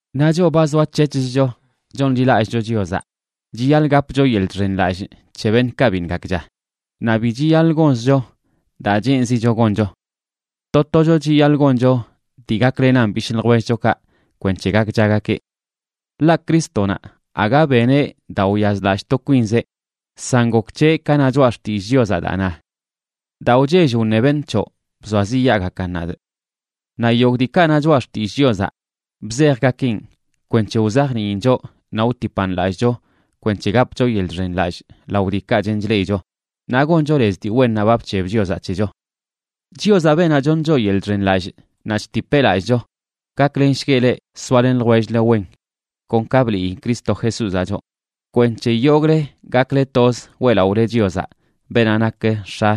Naꞌ choꞌ ba zoac̱hec̱hcho chonḻilallꞌcho Chiozaꞌ, chiyaḻꞌ gapcho yeḻꞌ chxenlallꞌ c̱he beṉꞌkaꞌ biṉꞌ gakcha, naꞌ bi chiyaḻꞌ gonzcho daa cheenzicho goncho. To tocho chiyaḻꞌ goncho dii gaklenan bishꞌ ljwellchokaꞌ kwenc̱he gakchagakeꞌ. Ḻaꞌ Crístonaꞌ aga beneꞌ daa wyazlallꞌ to kwinzeꞌ, san gok c̱heꞌ ka na Choꞌa Xtillꞌ Chiozaꞌ, daa na: “Daa wchell wṉe beṉꞌ c̱hoꞌ bzoaziꞌyaagakan nadꞌ.” Naꞌ yogꞌ diikaꞌ na Choꞌa Xtillꞌ Chiozaꞌ bzejgakeꞌn kwenc̱he wzajniin choꞌ naꞌ wtipan lallꞌcho kwenc̱he gapcho yeḻꞌ chxenlallꞌ lao diikaꞌ chen chleꞌicho naꞌ goncho lez dii wennaꞌ ba bc̱heb Chiozaꞌ c̱hecho. Chiozaꞌ, beenaꞌ choṉ choꞌ yeḻꞌ chxenlallꞌ naꞌ chtipeꞌ lallꞌcho, gaklenshgueꞌ leꞌ soalen ljwell-le wen kon ka bliꞌyi Cristo Jesúzaꞌ choꞌ, kwenc̱he yogꞌle gakle toz weꞌlaꞌole Chiozaꞌ, beenaꞌ nak X̱a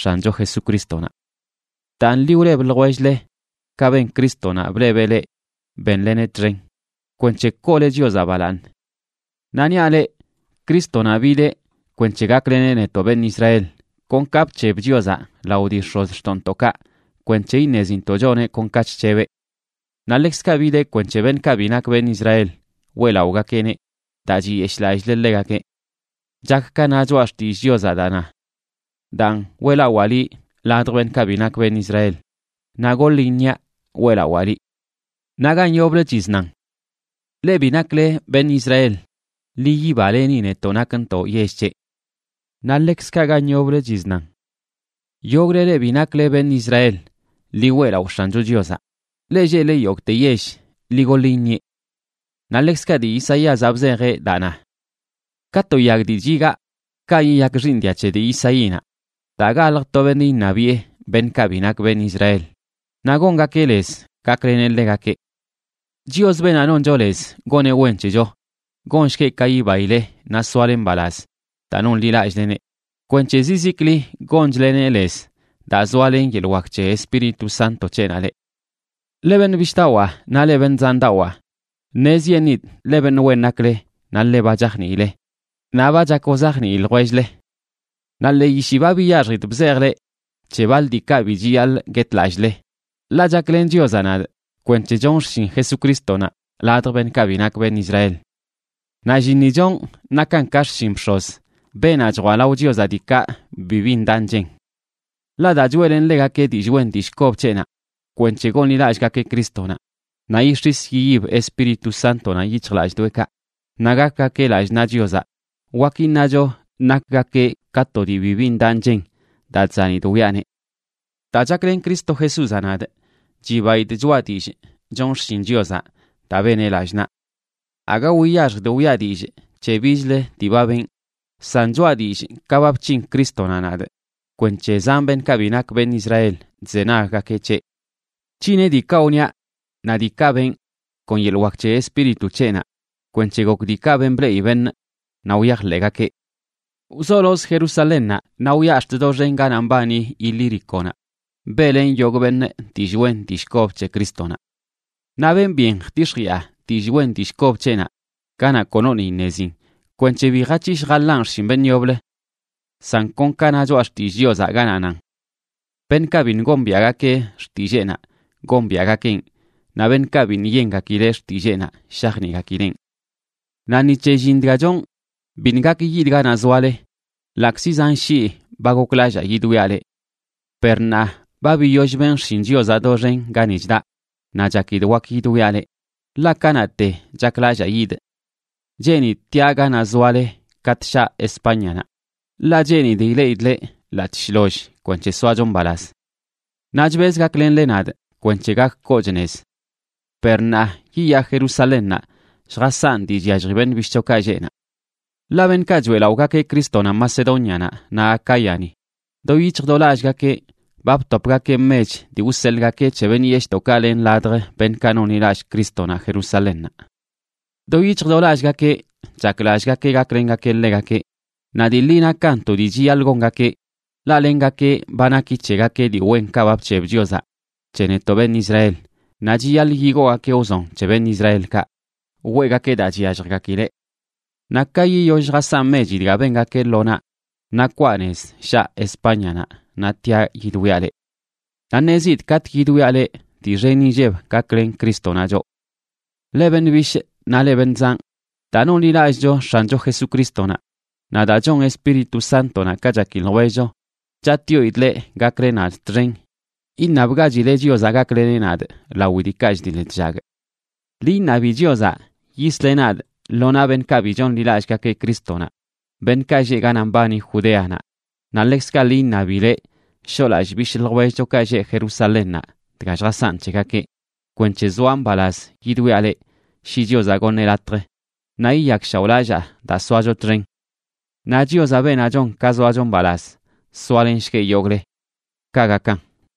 X̱ancho Jesucrístonaꞌ. Daan, ḻi wleb ljwell-le, ka ben Crístonaꞌ blebeꞌ leꞌ bénleneꞌ txen, kwenc̱he koole Chiozaꞌ balaaṉ. Naꞌ niaꞌ leꞌ, Crístonaꞌ bideꞌ kwenc̱he gakleneꞌ netoꞌ beṉꞌ Israel, kon ka bc̱heb Chiozaꞌ lao dii x̱ozxtoꞌntoꞌkaꞌ kwenc̱he iṉezintoꞌ choneꞌ kon ka chc̱hebeꞌ. Naꞌ ḻekzkaꞌ bideꞌ kwenc̱he beṉꞌkaꞌ bi nak beṉꞌ Israel weꞌlaꞌogakeꞌneꞌ daa chiyeshꞌlallileꞌ ḻegakeꞌ. Chak ka na Choꞌa Xtillꞌ Chiozaꞌ daa na: Daan, weꞌlawaa liꞌ ladj beṉꞌkaꞌ bi nak beṉꞌ Israel, naꞌ goḻꞌ iṉiaꞌ weꞌlawaa liꞌ. Naꞌ gan yoblə chiznan: Leꞌ bi nakle beṉꞌ Israel, ḻi yibaleni netoꞌ nakntoꞌ yell c̱heꞌ. Naꞌ ḻekzkaꞌ gan yoblə chiznan: Yogꞌle leꞌ bi nakle beṉꞌ Israel, ḻi weꞌlaꞌo X̱ancho Chiozaꞌ. Leꞌ lleꞌle yogꞌte yell, ḻi goḻ iṉieꞌ. Naꞌ ḻekzkaꞌ dii Isaíazaꞌ bzejeꞌ daa na: Ka to yag dii chigaa, kaꞌ yiyak xiiṉ dia c̱he dii Isaínaꞌ, daa galj to beṉꞌ iṉabiꞌe beṉꞌkaꞌ bi nak beṉꞌ Israel, naꞌ gongakeꞌ lez gakleneꞌ ḻegakeꞌ. Chios, beenaꞌ noncho lez goneꞌ wen c̱hecho, gonshgueꞌ ka yibaile naꞌ soale mbalaz daa nonḻilallꞌlene, kwenc̱he zizikli gonchleneꞌ lez daa zoalen yeḻꞌ wak c̱he Espíritu Sánto c̱heꞌnaꞌ leꞌ. Leꞌ beṉꞌ bishꞌdawaa naꞌ leꞌ beṉꞌ zandawaa, ṉezyeṉidꞌ ḻe beṉꞌ wen nakle naꞌ ḻe ba chajniile, naꞌ ba chak wzajnii ljwell-le. Naꞌ ḻee yishi ba biyaxjidꞌ bzejꞌ leꞌ c̱he baḻ diikaꞌ bi chiyaḻꞌ guetlallꞌle, ḻaꞌ chaklen Chiozaꞌ nadꞌ kwenc̱he chonꞌ xshin Jesucrístonaꞌ ladj beṉꞌkaꞌ bi nak beṉꞌ Israel. Naꞌ llinni chonꞌ nakan ka xshin bx̱oz, beenaꞌ chjwaꞌ lao Chiozaꞌ diikaꞌ bibi ndaꞌ nchen. Ḻaꞌ daa choeꞌlenꞌ ḻegakeꞌ dillꞌ wen dillꞌ kob c̱heꞌnaꞌ kwenc̱he gonḻilallꞌgakeꞌ Crístonaꞌ, naꞌ yix̱is yiyib Espíritu Sántonaꞌ yic̱hjlallꞌdoꞌekaꞌ, naꞌ gakgakeꞌ lallꞌ naꞌ Chiozaꞌ, wak iṉacho nakgakeꞌ ka to dii bibi ndaꞌ nchen daa chzanidꞌ wiꞌaneꞌ. Daa chaklen Cristo Jesúzaꞌ nadꞌ, chibaidꞌ choꞌa dillꞌ chonꞌ xshin Chiozaꞌ daa beneꞌ lallꞌ naꞌ. Aga wiyaxjidꞌ wiꞌa dillꞌ c̱he bichlə dii ba benꞌ, san choꞌa dillꞌ ka ba bc̱hin Crístonaꞌ nadꞌ kwenc̱he zan beṉꞌkaꞌ bi nak beṉꞌ Israel chzenaggakeꞌ c̱heꞌ. Bc̱hineꞌ diikaꞌ wniaꞌ naꞌ diikaꞌ benꞌ kon yeḻꞌ wak c̱he Espíritu c̱heꞌnaꞌ kwenc̱he gok diikaꞌ ben bleꞌi beṉꞌ naꞌ wyajḻeꞌgakeꞌ. Wzolozꞌ Jerusalénnaꞌ naꞌ wyaꞌ ax̱t doxen ganaꞌ mbani Ilíriconaꞌ beꞌlenꞌ yogꞌ beṉꞌ dillꞌ wen dillꞌ kob c̱he Crístonaꞌ. Naꞌ benꞌ byen jtix̱jiꞌa dillꞌ wen dillꞌ kob c̱heꞌnaꞌ ganaꞌ konoṉꞌ iṉezin, kwenc̱he bi jac̱hishꞌ jaḻanꞌ xshin beṉꞌ yoblə. San kon ka na Choꞌa Xtillꞌ Chiozaꞌ, ganaꞌ nan: Beṉꞌkaꞌ biṉꞌ gombiaꞌgakeꞌ xtilleenaꞌ, gombiaꞌgakeꞌn, naꞌ beṉꞌkaꞌ biṉꞌ yengakileꞌ xtilleenaꞌ, shajniꞌgakileꞌn. Naꞌ ni c̱he llin dga chonꞌ biṉꞌ gak yidꞌ ganaꞌ zoale, ḻaꞌkzi zan shii ba goklallaa yidwiaꞌ leꞌ. Per ṉaa ba biyoll benꞌ xshin Chiozaꞌ doxen gani chdaꞌ, naꞌ chakidꞌ wak yidwiaꞌ leꞌ, ḻaꞌ kanaꞌte chaklallaa yidꞌ. Cheenidꞌ tiaꞌ ganaꞌ zoale katꞌ shaꞌ Espáñanaꞌ, ḻaꞌ cheenidꞌ ileꞌidꞌ leꞌ, ḻaꞌc̱hꞌ shloll, kwenc̱he soacho mbalaz. Naꞌ chbezꞌ gaklenle nadꞌ kwenc̱he gak koochꞌ nez. Per ṉaa, yiyaa Jerusalénnaꞌ lljasanꞌ dii chyallji beṉꞌ bishꞌchokaꞌ lleꞌ naꞌ. Ḻaꞌ beṉꞌkaꞌ choeꞌlaꞌogakeꞌ Crístonaꞌ Macedónianaꞌ naꞌ Acáyani do yic̱hj do lallꞌgakeꞌ ba btopgakeꞌ mech dii wseḻꞌgakeꞌ c̱he beṉꞌ yeshꞌdoꞌkaꞌ len ladj beṉꞌkaꞌ nonḻilallꞌ Crístonaꞌ Jerusalénnaꞌ. Do yic̱hj do lallꞌgakeꞌ chaklallꞌgakeꞌ gaklengakeꞌ ḻegakeꞌ, naꞌ dii ḻi nakan to dii chiyaḻꞌ gongakeꞌ, ḻaꞌ lengakeꞌ ba naki c̱hegakeꞌ dii wenkaꞌ ba bc̱heb Chiozaꞌ c̱he netoꞌ beṉꞌ Israel, naꞌ chiyaḻꞌ yigoogakeꞌ wzon c̱he beṉꞌ Israelkaꞌ weꞌgakeꞌ daa chyalljgakileꞌ. Naꞌ ka yiyoll lljasanꞌ mechi dga bengakeꞌ lo naꞌ, naꞌ kwaa nez shaꞌ Espáñanaꞌ naꞌ tiaꞌ yidwiaꞌ leꞌ. Naꞌ ṉezidꞌ katꞌ yidwiaꞌ leꞌ, dii xen inlleb gaklen Crístonaꞌ choꞌ. Leꞌ beṉꞌ bishꞌ naꞌ leꞌ beṉꞌ zanꞌ, daa nonḻilallꞌcho X̱ancho Jesucrístonaꞌ naꞌ daa chon Espíritu Sántonaꞌ ka chaki ljwellcho, chatꞌyoidꞌ leꞌ gakle nadꞌ txen iṉabgachile Chiozaꞌ gakleneꞌ nadꞌ lawi diikaꞌ chdiḻ chllagꞌ. Ḻi iṉabi Chiozaꞌ yisleꞌ nadꞌ lo naꞌ beṉꞌkaꞌ bi chonḻilallꞌgakeꞌ Crístonaꞌ, beṉꞌkaꞌ lleꞌ ganaꞌ mbani Judeanaꞌ, naꞌ ḻekzkaꞌ ḻi iṉabileꞌ shoꞌlallꞌ bishꞌ ljwellchokaꞌ lleꞌ Jerusalénnaꞌ dga lljasanꞌ c̱hegakeꞌ, kwenc̱he zoaꞌ mbalaz yidwiaꞌ leꞌ, shi Chiozaꞌ goṉeꞌ latj, naꞌ yiyakshaoꞌlallaa daa soacho txen. Naꞌ Chiozaꞌ, beenaꞌ chon ka zoacho mbalaz, soalenshgueꞌ yogꞌle. Kaꞌ gakan.